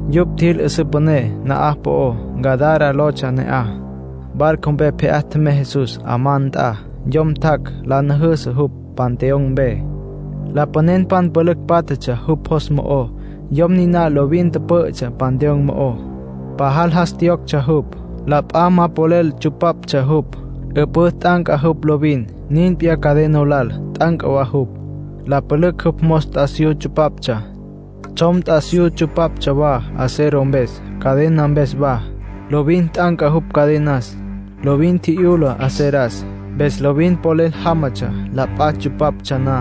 Yupj tjil 'üsǘ püné na'aj po'ó. Gadara lotsja ne'aj. Barco mpe pje'á tjemey Jesús 'amá nt'a. Yom tjac' la nüjüsü jupj panteón mpe. Lapanenpan pülücj pátjatsja jupj jos mo'ó. Yom niná lovin tüpǘ'ütsja panteón mo'ó. Pajal jas tjiyoctsja jupj. La p'a ma polel tsupaptsja jupj, 'üpǘ t'anca jupj lovin. Nin p'iyá cadena lal, t'anca wa jupj. La pülücj jupj mos t'asiyú tsupaptsja, tsjom t'asiyú tsupaptsja wa acero mpes, cadena mpes wa. Lovin t'anca jupj cadenas. Lovin tji'yula aceras. Mpes lovin polel jámatsja la p'a tsupaptsja na.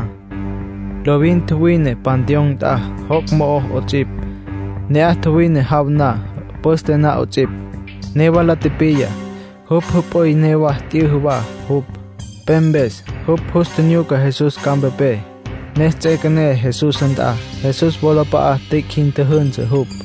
Lovin tjuwine panteón nt'a, joc' mo'ó 'ots'ipj. Ne'aj tjuwine jaw na, püste na 'ots'ipj. Newa la tipiya, jupj jüp'üy newa t'yüjü wa jupj, pe mpes. Jupj jus tjinyuca Jesús campa mpe, ne ts'üequené Jesús nt'a. Jesús wolap'a'a tüic' jin tjüjünsü jupj.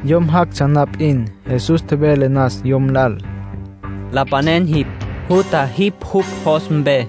Yom jactsja na p'in, Jesús tjevele nas yom lal: —Lapanen jipj. ¡Jutja jipj jupj jos mpe!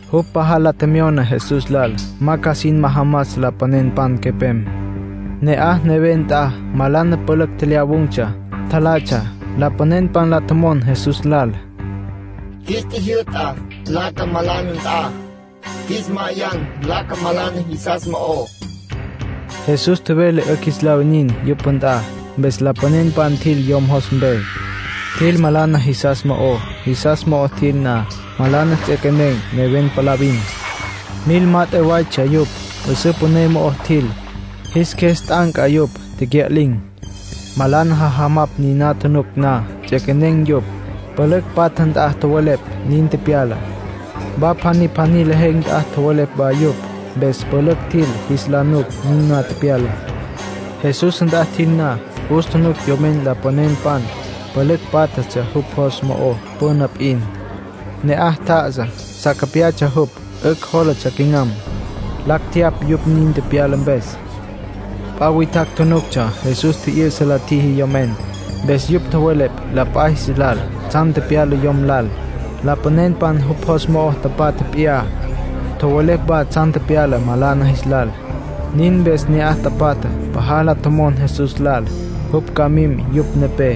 Jupj pajal la tjemyona Jesús lal ma ca sin majamas lapanenpan quepem. Ne'aj neven nt'a malana pülücj tjelyawun̈tsja, tjalatsja. Lapanenpan la tjomon Jesús lal: —Qjuis tjijyü'ta nlaca malana nt'a. Qjuis ma'ayan nlaca malana jisas mo'ó. Jesús tjevele 'ücj jis la winin yupj nt'a. Mpes lapanenpan tjil yom jos mpe. Tjil malana jisas mo'ó. Jisas mo'o tjil na, malana ts'equenen̈ neven palavin. Mil mat'e waytsja yupj. 'Üsǘ püné mo'o tjil. Jis qjues t'anca yupj, tecya'lin̈. Malana jajamapj niná tjunuc na, ts'equenen̈ yupj. Pülücj patja nt'a tjowelepj nin tepyalá. Wa pjaní pjaní lejen̈ nt'a tjowelepj wa yupj. Mpes pülücj tjil jis la nuc niná tepyalá. Jesús nt'a tjil na, jus tjunuc yomen lapanenpan pülücj pátjatsja jupj jos mo'ó püna p'in. Ne'aj tjá'asa. Sa capyatsja jupj, 'ücj jólatsja quinam. Lacj tjeyapj yupj nin tepyala mpes. P'a witjacj tjunuctsja Jesús tji'yü'sa la tjiji yomen. Mpes yupj tjowelepj la p'a jis lal tsjan tepyala yom lal, lapanenpan jupj jos mo'o tapatja p'iyá. Tjowelepj wa tsjan tepyala malana jilal. Nin mpes ne'aj tapatjá pajal la tjomon Jesús lal jupj ca mim yupj nepé.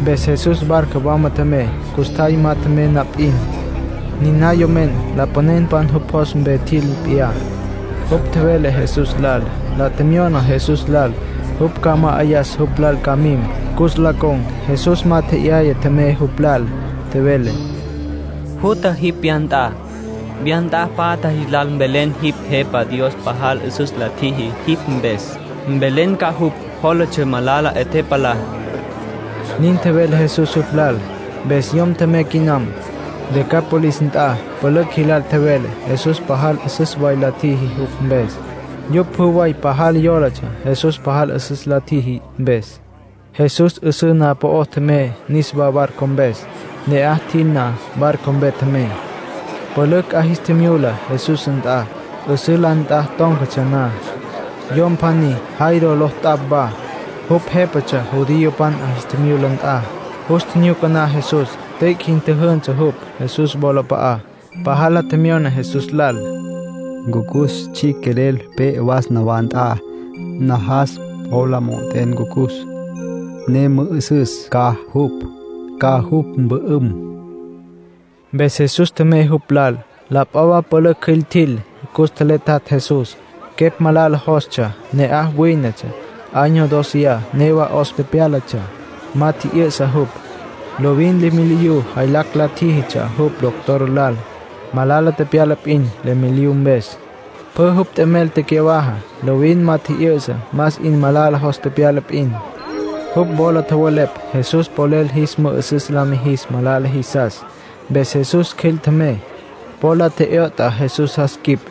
Mpes Jesús barco wama tjemey. Custjay ma tjemey na p'in, niná yomen, lapanenpan jupj jos mpe tjil p'iyá, jupj tjevele Jesús lal. La tjemyona Jesús lal jupj ca ma'ayas jupj lal ca mim, cus la con̈. Jesús ma tje'yaya tjemey jupj lal. Tjevele: —Jutja jipj wya nt'a. Wya nt'a patja jis lal mvelen jipj Jepa Dios pajal 'üsüs la tjiji jipj mpes. Mvelen ca jupj jólatsja malala 'e tepalá —nin tjevele Jesús jupj lal. Mpes yom tjemey quinam. Decápolis nt'a pülücj jilal tjevele Jesús pajal 'üsüs way la tjiji jupj mpes. Yupj pjü way pajal yólatsja Jesús pajal 'üsüs la tjiji mpes. Jesús 'üsǘ na'aj po'ó tjemey niswá barco mpes. Ne'aj tjil na, barco mpe tjemey. Pülücj 'a jis tjimyula Jesús nt'a, 'üsǘ la nt'a tón̈catsja na. Yom pjaní Jairo ló tjac' wa. Jupj jépatsja judiopan 'a jis tjimyula nt'a. Jus tjinyuca na Jesús, tüic' jin tjüjünsü jupj Jesús wolap'a'á. Pajal la tjemyona Jesús lal: —Ncucus tsjicj quelel pe'e. Was nawá nt'a. Najas po la mo'ot'en ncucus, ne mü'ü'süs ca jupj, ca jupj mpü'üm. Mpes Jesús tjemey jupj lal. La p'a wa pülücj cjüil tjil. Cus tjeletjatj Jesús. Quepj malala jostsja ne'aj wínetsja. Año dóceya newa 'os tepyálatsja, ma tji'yü'sa jupj. Lovin leméliyu jaylacj la tjíjitsja jupj doctor lal. Malala tepyala p'in leméliyu mpes. Pjü jupj t'emel tecyawaja. Lovin ma tji'yü'sa, más 'in malala jos tepyala p'in. Jupj wola tjowelepj Jesús polel jis mü'ü'süs la mijis malala jisas. Mpes Jesús cjüil tjemey. Po la tje'yot'a Jesús jas quip.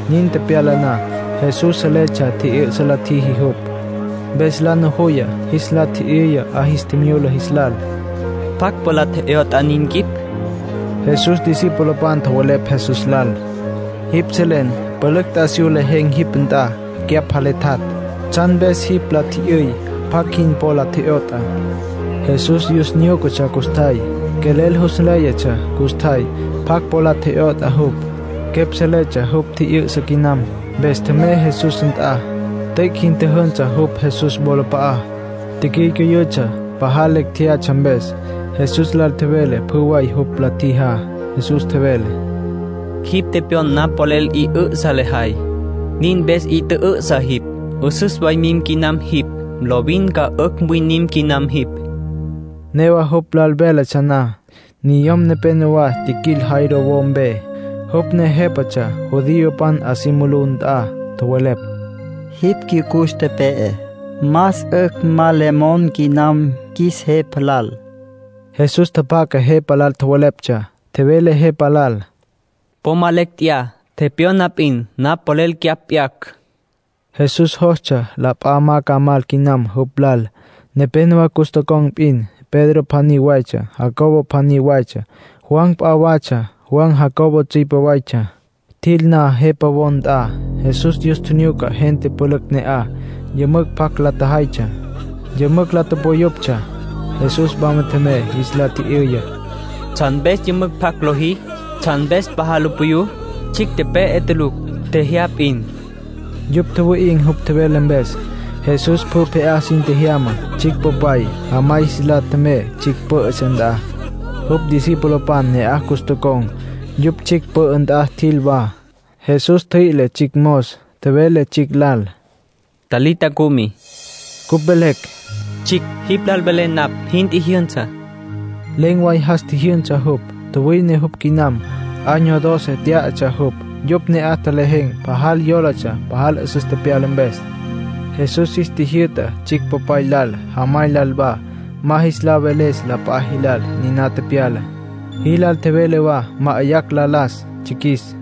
Nin tepyala na, Jesús seletsja tji'yü'sa la tjiji jupj. Mpes la nujuya, jis la tji'yüya 'a jis tjimyula jis lal: —¿Pjacj po la tje'yot'a nin quip? Jesús discipulopan tjowelepj Jesús lal: —Jipj selen pülücj t'asiyú lejen̈ jipj nt'a, cyapj jaletjatj. ¿Tsjan mpes jis la tji'yüy pjacj jin po la tje'yot'a? Jesús yus nyúcatsja custjay. Quelel jus nléyatsja custjay pjacj po la tje'yot'a jupj. Quepj seletsja jupj tji'yü'sa quinam, mpes tjemey Jesús nt'a, tüic' jin tjüjünsü jupj Jesús wolap'a'á. Ticyücüyütsja, pajal lecj tjeyatsja mpes. Jesús lal tjevele pjü way jupj la tjijá. Jesús tjevele: —Jipj tepyon napj polel 'i 'ü'sa lejay. Nin mpes 'i tjü'ü'sa jipj. 'Üsüs way mim quinam jipj. Lovin ca 'ücj winim quinam jipj. Newa jupj lal véletsja na, niyom nepenowá tjiquil Jairo wo mpe, jupj ne jépatsja judiopan 'a si mulú nt'a. Tjowelepj: —Jipj cyucus tepe'e. Más 'ücj ma le mon quinam qjuis Jepa lal. Jesús tjapjaca jepa lal tjoweleptsja. Tjevele jepa lal: —Po ma lecj tjeyá. Tepyona p'in napj polel cyapj p'yacj. Jesús jostsja la p'a ma ca mal quinam jupj lal. Nepénowa cus tocon̈ p'in. Pedro pjaní waytsja, Jacobo pjaní waytsja, Juan p'a watsja. Juan Jacobo tsüipe waytsja. Tjil na jepa wo nt'a, Jesús yus tjinyuca gente pülücj ne'aj, yümücj pjac la tjajaytsja. Yümücj la tupuyuptsja. Jesús wama tjemey, jis la tji'yüya: —¿Tsjan mpes yümücj pjac lojí? ¿Tsjan mpes pajal lu puyú? Tsjicj tepe'e tulucj. Tjejyá p'in. Yupj tjuwi'in̈ jupj tjevele mpes. Jesús pjü pje'á sin tjejyama. Tsjicj popay, jamay jis lal tjemey tsjicj pǘ'ütsja nt'a. Jupj discipulopan ne'aj cus tocon̈, yupj tsjicj pü'ü nt'a tjil wa. Jesús ntjüi'le tsjicj mos. Tjevele tsjicj lal: —Talita, cumi. (Cupj velecj: “Tsjicj, jipj lal velé napj, jin tjijyünsa”.) Len̈ way jas tjijyünsa jupj. Tjuwine jupj quinam (Año doce tyá'atsja jupj.) Yupj ne'aj tjelejen̈ pajal yólatsja pajal 'üsüs tepyala mpes. Jesús jis tjijyü'ta tsjicj popay lal, jamay lal wa, ma jis la veles la p'a jilal niná tepyalá. Jilal tjevele wa ma'ayacj la las tsjiquis.